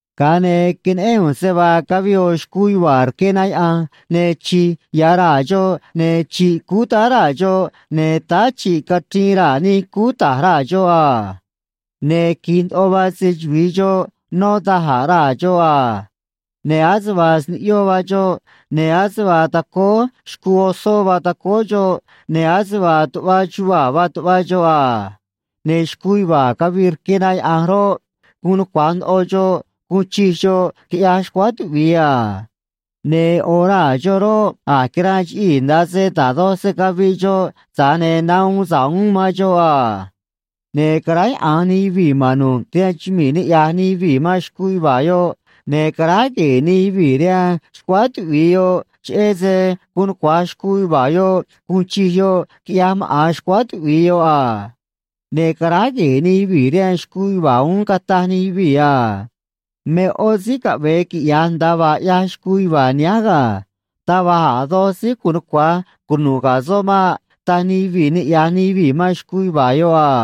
Ga̱a ne̱ queneꞌén ꞌu̱nj se vaa cavii ꞌo̱ xcuu yuva̱a̱ rque na yaꞌa̱nj, ne̱ chi̱j ya̱ raa̱ xoꞌ, ne̱ chi̱ꞌ cúú táá raa̱ xoꞌ, ne̱ táá chi̱ꞌ cachriin raa̱ nij cúú ta̱j raa̱ xoꞌ a. Ne̱ qui̱j ndoꞌo vaa se‑chuvi̱i xoꞌ nó da̱j a̱ raa̱ xoꞌ a. Ne̱ ase vaa sniꞌyó vaa xoꞌ, ne̱ ase vaa tacóó xcuu osó vaa tacóó xoꞌ, ne̱ ase vaa tuꞌva chuvaa̱ vaa tuꞌva xoꞌ a. Ne̱ xcuu yuva̱a̱ cavii rque na yaꞌa̱nj roꞌ, guun nucua̱j ndoꞌo xoꞌ guun chij xoꞌ, quiꞌyaj xcuáá tuꞌvi̱i a. Ne̱ ꞌo̱ raa̱ xoꞌ roꞌ, a̱j quiranꞌ chiꞌii̱ nda̱a se da̱j doj se caviꞌ xoꞌ, tza̱j ne̱ nahuun sa̱ꞌ uún man xoꞌ a. Ne̱ caráyaꞌa̱nj nij yuvii̱ ma̱n nu̱ꞌ rihaan chumii̱ niꞌya̱j nij yuvii̱ man xcuu yuva̱a̱ yoꞌ, ne̱ caráj gue̱e̱ nij yuvii̱ rihaan xcuáá tuꞌvi̱i yoꞌ, cheꞌé se guun nucua̱j xcuu yuva̱a̱ yoꞌ guun chij yoꞌ, quiꞌyaj maꞌa̱n xcuáá tuꞌvi̱i yoꞌ a. Ne̱ caráj gue̱e̱ nij yuvii̱ rihaan xcuu yuva̱a̱ uún, cataj nij yuvii̱ a: ―Me ꞌó síí caꞌve̱e quiꞌya̱j nda̱a vaa ꞌyaj xcuu yuva̱a̱ nihánj ga̱. Taj va̱j a̱ doj síí gu̱un nucua̱j cunu̱ꞌ ga̱ soꞌ maꞌ ―taj nij yuvii̱ niꞌya̱j nij yuvii̱ man xcuu yuva̱a̱ yoꞌ a.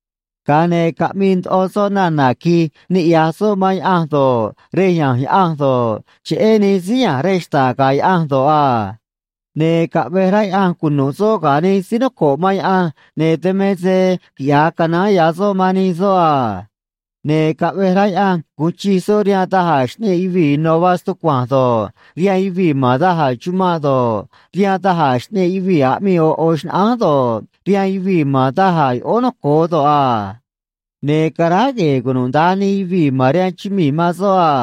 Ga̱a ne̱ caꞌmii ndoꞌo soꞌ nana̱ qui̱j niꞌya̱j soꞌ man Yaꞌanj do̱ꞌ, rej ya̱nj Yaꞌanj do̱ꞌ, cheꞌé nij síí ya̱nj rej xta̱ꞌ ga̱ Yaꞌanj do̱ꞌ a. Ne̱ caꞌvej rá Yaꞌanj cunu̱ꞌ soꞌ ga̱ nij síí noco̱ꞌ man Yaꞌanj, ne̱ dan me se quiꞌya̱j canaán ya̱ soꞌ man nij soꞌ a. Ne̱ caꞌvej rá Yaꞌanj gu̱un chij soꞌ rihaan da̱j a̱ xꞌneꞌ yuvii̱ ino̱ vaa stucua̱nj do̱ꞌ, rihaan yuvii̱ ma̱n da̱j a̱ chumanꞌ do̱ꞌ, rihaan da̱j a̱ xꞌneꞌ yuvii̱ aꞌmii ꞌo̱ ꞌo̱ xnaꞌánj do̱ꞌ, rihaan yuvii̱ ma̱n da̱j a̱ yoꞌóó noco̱o do̱ꞌ a. Ne̱ caráj gue̱e̱ cunuda̱nj nij yuvii̱ ma̱n rihaan chumii̱ man soꞌ a.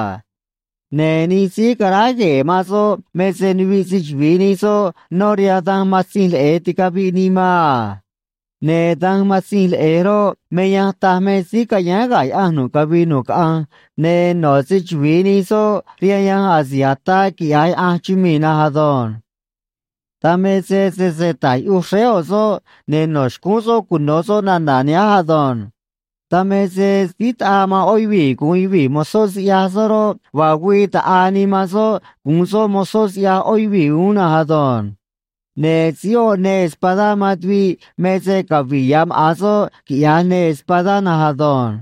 Ne̱ nij síí caráj gue̱e̱ man soꞌ me se nuviꞌ se‑chuvi̱i nij soꞌ nó rihaan danj Matzinj Leꞌe̱j ticaviꞌ nii man a. Ne̱ danj Matzinj Leꞌe̱j roꞌ, me yanj taj me síí ca̱yáán ga̱ Yaꞌanj nu̱ꞌ cavii nu̱ꞌ caꞌanj, ne̱ no̱ se‑chuvi̱i nij soꞌ rihaan yanj asi̱j ataa quiꞌya̱j Yaꞌanj chumii̱ na̱nj ado̱nj. Dan me se sese ta̱j yuꞌuj xréé ꞌo̱ soꞌ, ne̱ no̱ xcúún soꞌ cuno̱ soꞌ nana̱ nihánj ado̱nj. Dan me se síí taꞌaa man ꞌó yuvii̱ gu̱un yuvii̱ mozó siꞌyaj soꞌ roꞌ, vaa güii ta̱ꞌaa nii man soꞌ gu̱un soꞌ mozó siꞌyaj ꞌó yuvii̱ uún na̱nj ado̱nj. Ne̱ síí oꞌ neê espadá man tuviꞌ me se cavi̱ꞌ ya̱ maꞌa̱n soꞌ, quiꞌya̱j neê espadá na̱nj ado̱nj.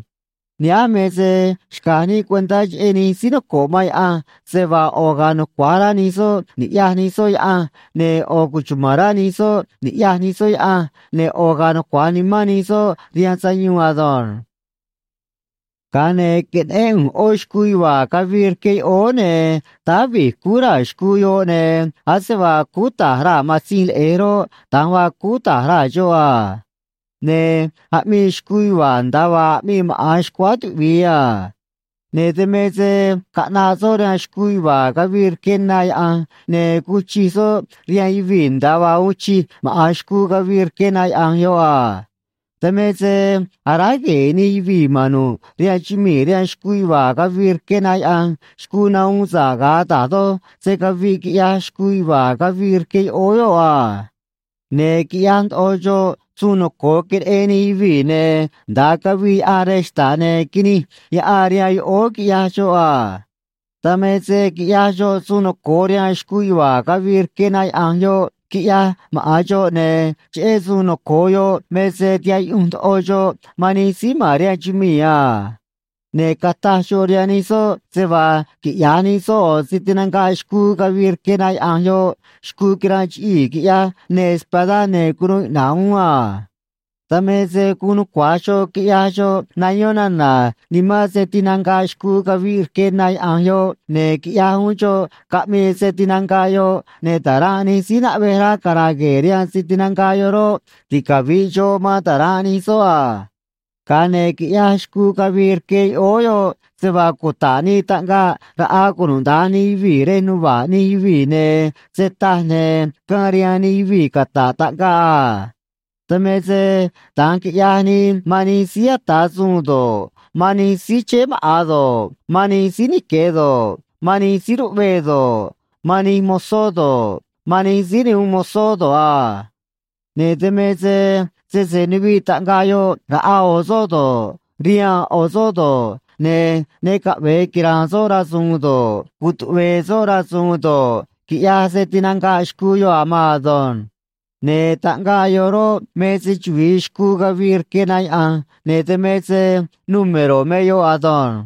Nihánj me se xca̱j níꞌ cuentá cheꞌé nij síí noco̱ꞌ man Yaꞌanj, se vaa ꞌo̱ ga̱a̱ nucua̱j rá nij soꞌ niꞌya̱j nij soꞌ Yaꞌanj, ne̱ ꞌo̱ cuchuma̱n rá nij soꞌ ni̱ꞌyaj nij soꞌ Yaꞌanj, ne̱ ꞌo̱ ga̱a̱ nucua̱j nimán nij soꞌ rihaan sayuun ado̱nj. Ga̱a ne̱ queneꞌén ꞌu̱nj ꞌó xcuu yuva̱a̱ cavii rque yoꞌóó, ne̱ táá vi̱j cúú raa̱ xcuu yoꞌ, ne̱ ase vaa cúú ta̱j raa̱ matzinj leꞌe̱j roꞌ, da̱nj vaa cúú ta̱j raa̱ xoꞌ a. Ne̱ aꞌmii xcuu yuva̱a̱ nda̱a vaa aꞌmii maꞌa̱n xcuáá tuꞌvi̱i a. Ne̱ dan me se caꞌnaꞌ soꞌ rihaan xcuu yuva̱a̱ cavii rque na yaꞌa̱nj, ne̱ guun chij soꞌ rihaan yuvii̱ nda̱a vaa uun chij maꞌa̱n xcuu cavii rque na yaꞌa̱nj yoꞌ a. Dan me se aráj gue̱e̱ nij yuvii̱ ma̱n nu̱ꞌ rihaan chumii̱ rihaan xcuu yuva̱a̱ cavii rque na yaꞌa̱nj xcuu nahuun sa̱ꞌ ga̱a da̱j doj se caviꞌ, quiꞌyaj xcuu yuva̱a̱ cavii rque yoꞌóó yoꞌ a. Ne̱ quiꞌyaj ndoꞌo xoꞌ suun noco̱o queneꞌen nij yuvii̱, ne̱ nda̱a cavii yaꞌan rej xta̱ꞌ ne̱ quinij yaꞌan rihaan yoꞌóó, quiꞌyaj xoꞌ a. Dan me se quiꞌyaj xoꞌ suun noco̱o rihaan xcuu yuva̱a̱ cavii rque na yaꞌa̱nj yoꞌ, quiꞌyaj maꞌa̱n xoꞌ, ne̱ cheꞌé suun noco̱o yoꞌ me se tihaꞌ yuꞌunj ndoꞌo xoꞌ man nij síí ma̱n rihaan chumii̱ a. Ne̱ cataj xoꞌ rihaan nij soꞌ se vaa quiꞌya̱j nij soꞌ ꞌo̱ se tinanga̱ꞌ xcuu cavii rque na yaꞌa̱nj yoꞌ xcuu quiranꞌ chiꞌii̱ quiꞌyaj neê espadá ne̱ cunuu iꞌna̱ꞌ uún a. Dan me se guun nucua̱j xoꞌ quiꞌyaj xoꞌ nayón nana̱ nimán se tinanga̱ꞌ xcuu cavii rque na yaꞌa̱nj yoꞌ, ne̱ quiꞌyaj uún xoꞌ caꞌmii se tinanga̱ꞌ yoꞌ, ne̱ ta̱ranꞌ nij síí naꞌvej rá cara̱a̱ gue̱e̱ rihaan se tinanga̱ꞌ yoꞌ roꞌ, ticavi̱ꞌ xoꞌ man ta̱ranꞌ nij soꞌ a. Ga̱a ne̱ quiꞌyaj xcuu cavii rque yoꞌóó yoꞌ se vaa cuta̱ꞌ nii taꞌngaꞌ raꞌa cunuda̱nj nij yuvii̱ rej nuva̱ꞌ nij yuvii̱, ne̱ se taj, ne̱ caan rihaan nij yuvii̱ cata̱ꞌ taꞌngaꞌ a. Dan me se da̱nj quiꞌyaj nii man nij síí ata̱ suun do̱ꞌ, man nij síí chéé maꞌa̱n do̱ꞌ, man nij síí nique̱ do̱ꞌ, man nij síí ruꞌvee do̱ꞌ, man nij mozó do̱ꞌ, man nij síí ne uun mozó do̱ꞌ a. Ne̱ dan me se sese nuviꞌ taꞌngaꞌ yoꞌ raꞌa ꞌo̱ soꞌ do̱ꞌ, rihaan ꞌo̱ soꞌ do̱ꞌ, ne̱ ne caꞌve̱e quira̱a̱n soꞌ rasu̱u̱n do̱ꞌ, cutuꞌve̱e̱ soꞌ rasu̱u̱n do̱ꞌ, quiꞌyaj se tinanga̱ꞌ xcuu yoꞌ a̱ maan ado̱nj. Ne̱ taꞌngaꞌ yoꞌ roꞌ, me se‑chuvi̱i xcuu cavii rque na yaꞌa̱nj, ne̱ dan me se número̱ me yoꞌ ado̱nj.